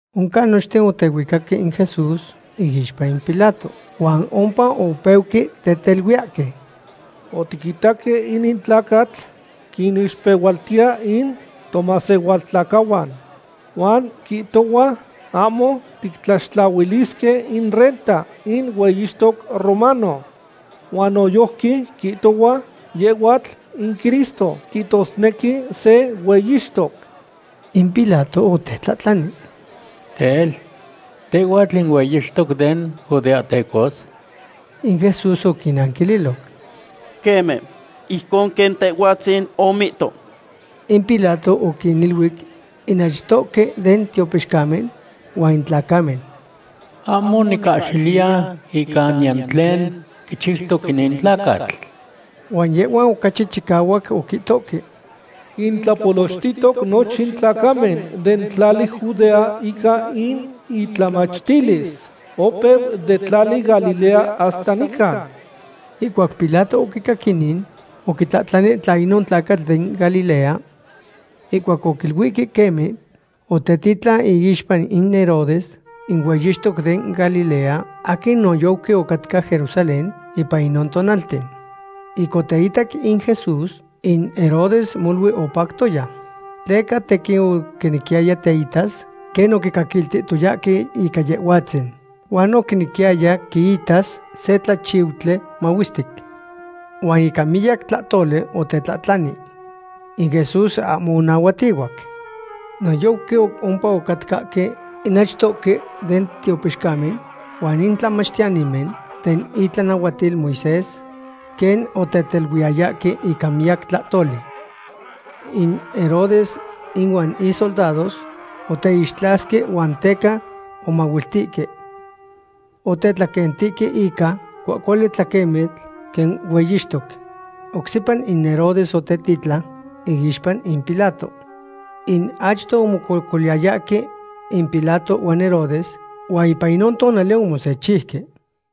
Oncan nochten otehuicaque in Jesús iixpa in Pilato. Huan ompa opeuque teteluiyahque: ―Otiquitaque inin tlacatl quinixpehualtiya in tomasehualtlacahuan. Huan quihtohua ahmo tictlaxtlahuilisque in renta in hueyixtoc romano. Huan noyojqui quihtohua yehhuatl in Cristo, quihtosnequi se hueyixtoc. In Pilato otetlahtlani: ―Tel, ¿tehhuatl in hueyixtoc den judeahtecos? In Jesús oquinanquililoc: ―Queme, ijcon quen tehhuatzin omihto. In Pilato oquiniluic in achtohque den tiopixcamen huan in tlacamen: ―Ahmo nicahxiliya ica niyan tlen quichiutoc inin tlacatl. Huan yehhuan ocachi chicahuac oquihtohque: ―Quintlapolochtihtoc nochin tlacamen den tlali Judea ica in itlamachtilis. Opeu den tlali Galilea hasta nican. Ihcuac Pilato oquicac inin, oquitlahtlani tla inon tlacatl den Galilea. Ihcuac oquiluihque queme, otetitlan iixpa in Herodes, in hueyixtoc den Galilea, aquin noyojqui ocatca Jerusalén ipan inon tonalten. Ic oteitac in Jesús, in Herodes molui opactoya. Tleca tequin oquinequiyaya teitas quen oquicaquiltihtoyahque ica Yehhuatzin huan oquinequiyaya quiitas se tlachiutli mahuestic. Huan ica miyac tlahtoli otetlahtlani. In Jesús ahmo onahuatihuac. Noyojqui ompa ocatcahque in achtohque den tiopixcamen huan in tlamachtiyanimen den itlanahuatil Moisés, quen oteteluiyayahque ica miyac tlahtoli. In Herodes inuan isoldados oteixtlasque huan teca omahuiltihque. Otetlaquentihque ica cuahcuali tlaquemitl quen hueyixtoc. Oc sepa in Herodes otetitlan iixpa in Pilato. In achto omococoliyayahque in Pilato huan Herodes huan ipan inon tonali omosechiuque.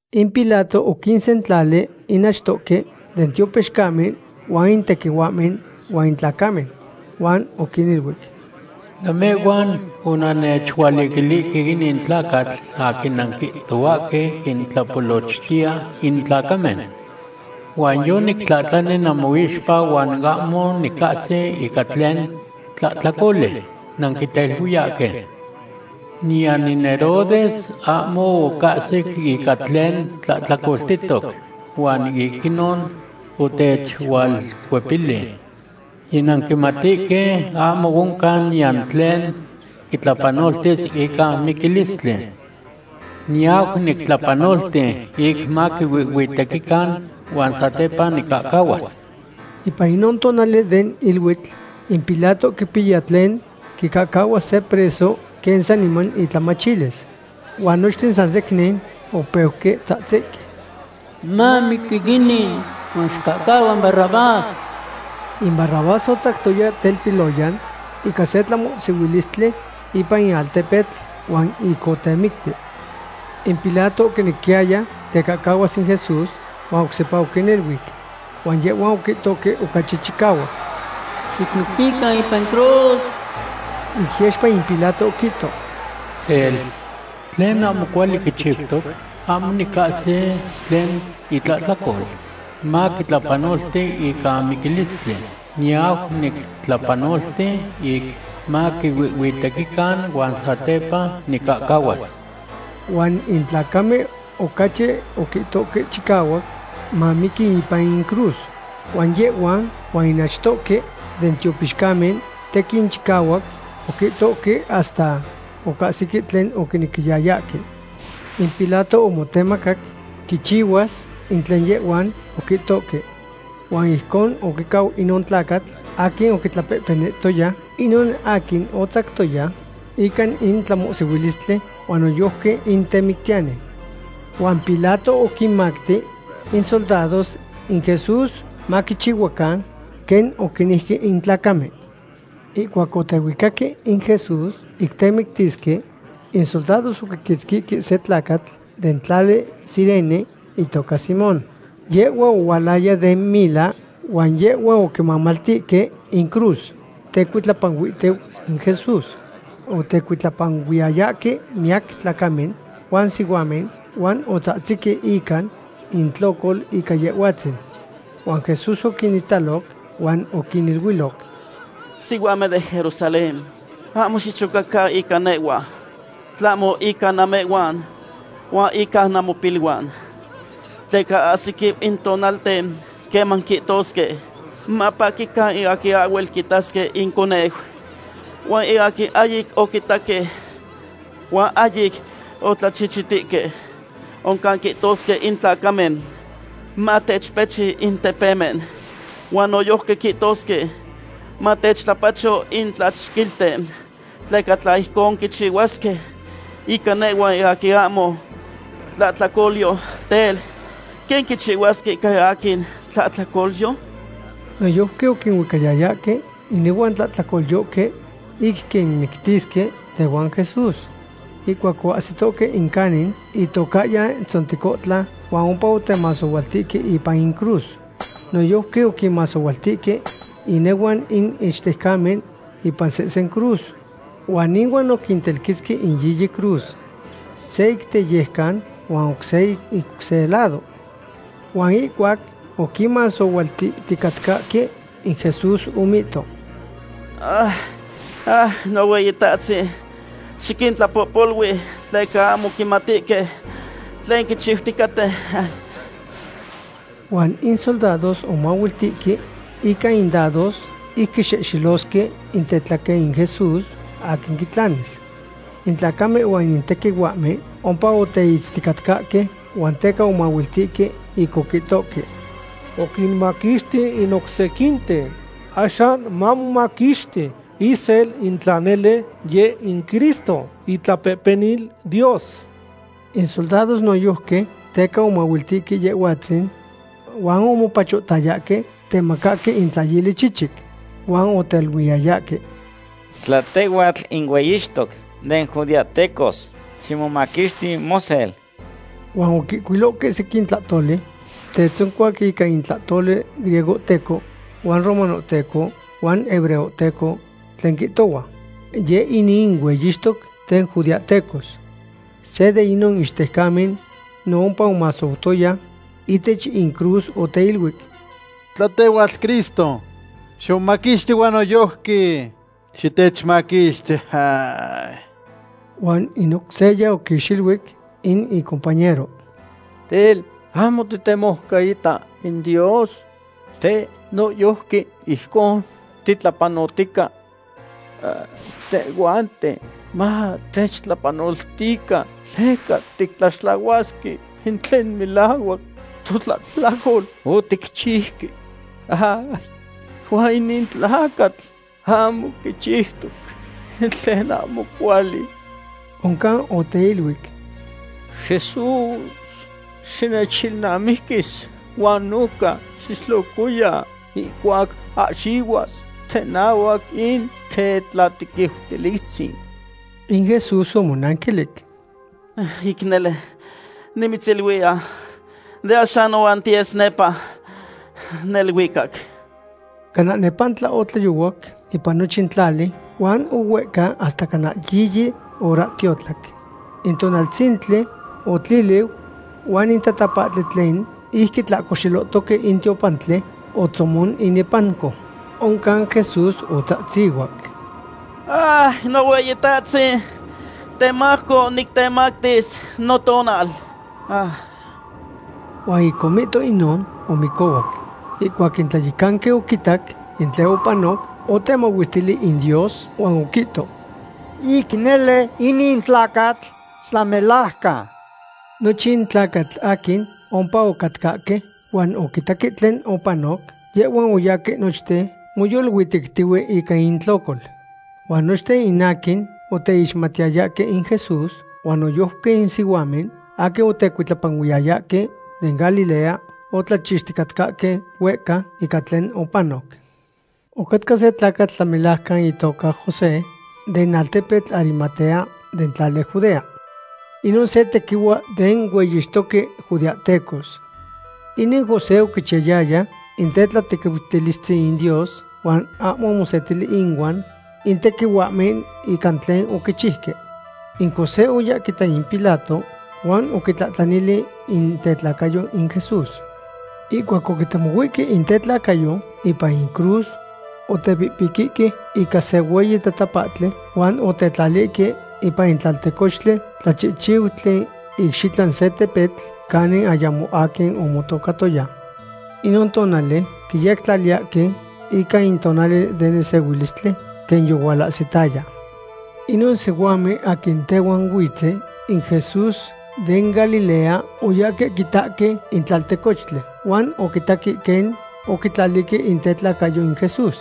In Pilato oquinsentlali in achtoque den tiopixcamen huan in tequihuahmen huan in tlacamen. Huan oquiniluic: ―Namehhuan onannechualiquilihque inin tlacatl aquin nanquihtohuahque quintlapolochtiya in tlacamen. Huan yonictlahtlani namoixpa huan ahmo nicahsi ica tlen tlahtlacoli nanquiteluiyahque. Niyan in Herodes ahmo ocahsic ica tlen tlahtlacoltihtoc. Huan ic inon otechualcuepili. Yinanquimatihque ahmo oncan niyan tlen quitlapanoltis ica miquilistli. Niyau nictlapanolti ic maquihuihhuitequican huan satepa nicahcahuas. Ipan inon tonali den iluitl in Pilato quipiya tlen quicahcahuas se preso quen saniman intlamachilis. Huan nochten san secnin opeuque tzahtzihque: ―¡Mamiqui inin huan xicahcahua in Barrabás! In Barrabás otzactoya telpiloyan ica se tlamohsihuilistli ipan in altepetl huan ic otemicti. In Pilato oquinequiyaya tecahcahuas in Jesús huan oc sepa oquiniluic. Huan yehhuan oquihtohque ocachi chicahuac: ―¡Xicmictican ipan cruz! Ic yexpa in Pilato oquihto: ―Tel, ¿tlen ahmo cuali quichiutoc? Ahmo nicahsi tlen itlahtlacol maquitlapanolti ica miquilistli. Niyau nictlapanolti ic maquihuihhuitequican huan satepa nicahcahuas. Huan in tlacamen ocachi oquihtohque chicahuac mamiqui ipan in cruz, huan yehhuan huan in achtohque den tiopixcamen tequin chicahuac oquihtohque hasta ocahsique tlen oquinequiyayahque. In Pilato omotemacac quichihuas in tlen yehhuan oquihtohque. Huan ijcon oquicau inon tlacatl aquin oquitlapehpenihtoya, inon aquin otzactoya ica in tlamohsihuilistli huan noyojqui in temictiyani. Huan Pilato oquinmacti in soldados in Jesús maquichihuacan quen oquinejque in tlacamen. Ihcuac otehuicaque in Jesús ic temictisque, in soldados oquiquitzquihque se tlacatl den tlali Cirene, itoca Simón. Yehhua ohualaya den mila huan yehhua oquimamaltihque in cruz tecuitlapanuihtiu in Jesús. Otecuitlapanuiyayahque miyac tlacamen huan sihuamen huan otzahtzihque ica intlocol ica Yehhuatzin. Huan Jesús oquinitaloc huan oquiniluiloc: ―Sihuamen den Jerusalén, ahmo xichocacan ica nehhua, tlahmo ica namehhuan huan ica namopiluan. Tleca ahsiquiu in tonalten queman quihtosque: “Mapaquican in aquin ahhuel quitasque inconeu, huan in aquin ahyic oquitaque huan ahyic otlachichitihque.” Oncan quihtosque in tlacamen: “Matechpechi in tepemen”; huan noyojqui quihtosque: “Matechtlapacho in tlachquilten.” Tleca tla ijcon quichihuasque ica nehhua in aquin ahmo tlahtlacolyo, tel, ¿quen quichihuasque ica in aquin tlahtlacolyo? Noyojqui oquinuicayayahque inehuan tlahtlacolyohque ic quinmictisque tehuan Jesús. Ihcuac oahsitoque in canin itocahyan Tzontecontla huan ompa otemasohualtihque ipan in cruz. Noyojqui oquinmasohualtihque inehuan in ichtejcamen ipan sehsen cruz. Huan inuan oquintelquetzque in yiyi cruz, se ic teyejcan huan oc se ic oc se lado. Huan ihcuac oquinmasohualtihticatcahque, in Jesús omihto: ―Nohueyitahtzin, xiquintlapohpolui tleca ahmo quimatihque tlen quichiuticaten. Huan in soldados omahuiltihque ica in dados ic quixehxelosque in tetlaquen in Jesús, aquin quitlanis. In tlacamen huan in tequihuahmen ompa oteitzticatcahque huan teca omahuiltihque ic oquihtohque: ―Oquimaquixti in oc sequinten; axan mamomaquixti isel in tla nele yeh in Cristo, itlapehpenil Dios. In soldados noyojqui teca omahuiltihque Yehhuatzin, huan omopachohtayahque temacahque in tlayili chichic. Huan oteiluiyayahque: ―Tla tehhuatl in hueyixtoc den judeahtecos, ximomaquixti mosel. Huan oquihcuilohque sequin tlahtoli tetzoncuac ica in tlahtoli griegohteco huan romanohteco huan hebreohteco, tlen quihtohua: “Yeh inin in hueyixtoc den judeahtecos.” Se de inon ichtejcamen no ompa omasoutoya ihtech in cruz oteiluic: ―Tla tehhuatl Cristo, ximomaquixti huan noyojqui xitechmaquixti. Huan in oc seya oquixiluic in icompañero: ―Tel, ¿ahmo titemoucaita in Dios? Teh noyojqui ijcon titlapanotica. Tehhuanten matechtlapanoltican tleca tictlaxtlahuasque in tlen melahuac totlahtlacol oticchiuque. Huan inin tlacatl ahmo quichiutoc in tlen ahmo cuali. Oncan oteiluic: ―Jesús, xinechilnamiquis huan noca xitlocoya ihcuac ahxihuas tenahuac in tetlatequiutilistzin. In Jesús omonanquilic: ―Ic nele nimitziluiya, de axan nohuan tiyes nepa neluicac. Cana nepantla otlayohuac ipan nochin tlali huan ohuehcau hasta cana yiyi horahtiotlac. In tonaltzintli otliliu huan in tatapahtli tlen ic quitlahcoxelohtoque in tiopantli otzomon inepanco. Oncan Jesús otzahtzihuac: ―Nohueyitahtzin, temajco nictemactis notonal. Huan ic omihto inon, omicohuac. Ihcuac in tlayecanqui oquitac in tlen opanoc, otemahuestili in Dios huan oquihto: ―Ic nele inin tlacatl tlamelajcan. Nochin tlacatl aquin ompa ocatcahque huan oquitaque tlen opanoc, yehhuan oyahque nochten moyoluitectihue ica intlocol. Huan nochten in aquin oteixmatiyayahque in Jesús, huan noyojqui in sihuamen aquin otecuitlapanuiyayahque den Galilea, otlachixticatcahque huehca ica tlen opanoc. Ocatca se tlacatl tlamelajcan itoca José den altepetl Arimatea den tlali Judea. Inon se tequihua den hueyixtoque judeahtecos. Inin José oquichiyayaya in tetlatequiutilistzin Dios huan ahmo omosetili inuan in tequihuahmen ica tlen oquichiuque. In José oya quita in Pilato huan oquitlahtlanili in tetlacayo in Jesús. Ihcuac oquitemohuihque in tetlacayo ipan in cruz, otepihpiqui ica se hueyi tatapahtli huan otetlalihque ipan in tlaltecochtli tlachihchiutli icxitlan se tepetl canin ayamo aquin omotocatoya. Inon tonali quiyectlaliyahque ica in tonali den nesehuilistli quen yohualahsitaya. Inon sihuamen aquin tehuan huitzen in Jesús den Galilea oyahque quitahque in tlaltecochtli huan oquitaque quen oquitlalihque in tetlacayo in Jesús.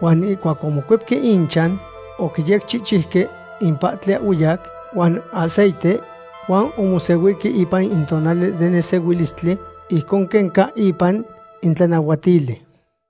Huan ihcuac omocuepque inchan, oquiyecchihchiuque in pahtli ahhueyac huan aceite huan omosehuihque ipan in tonali den nesehuilistli ijcon quen ca ipan in tlanahuatili.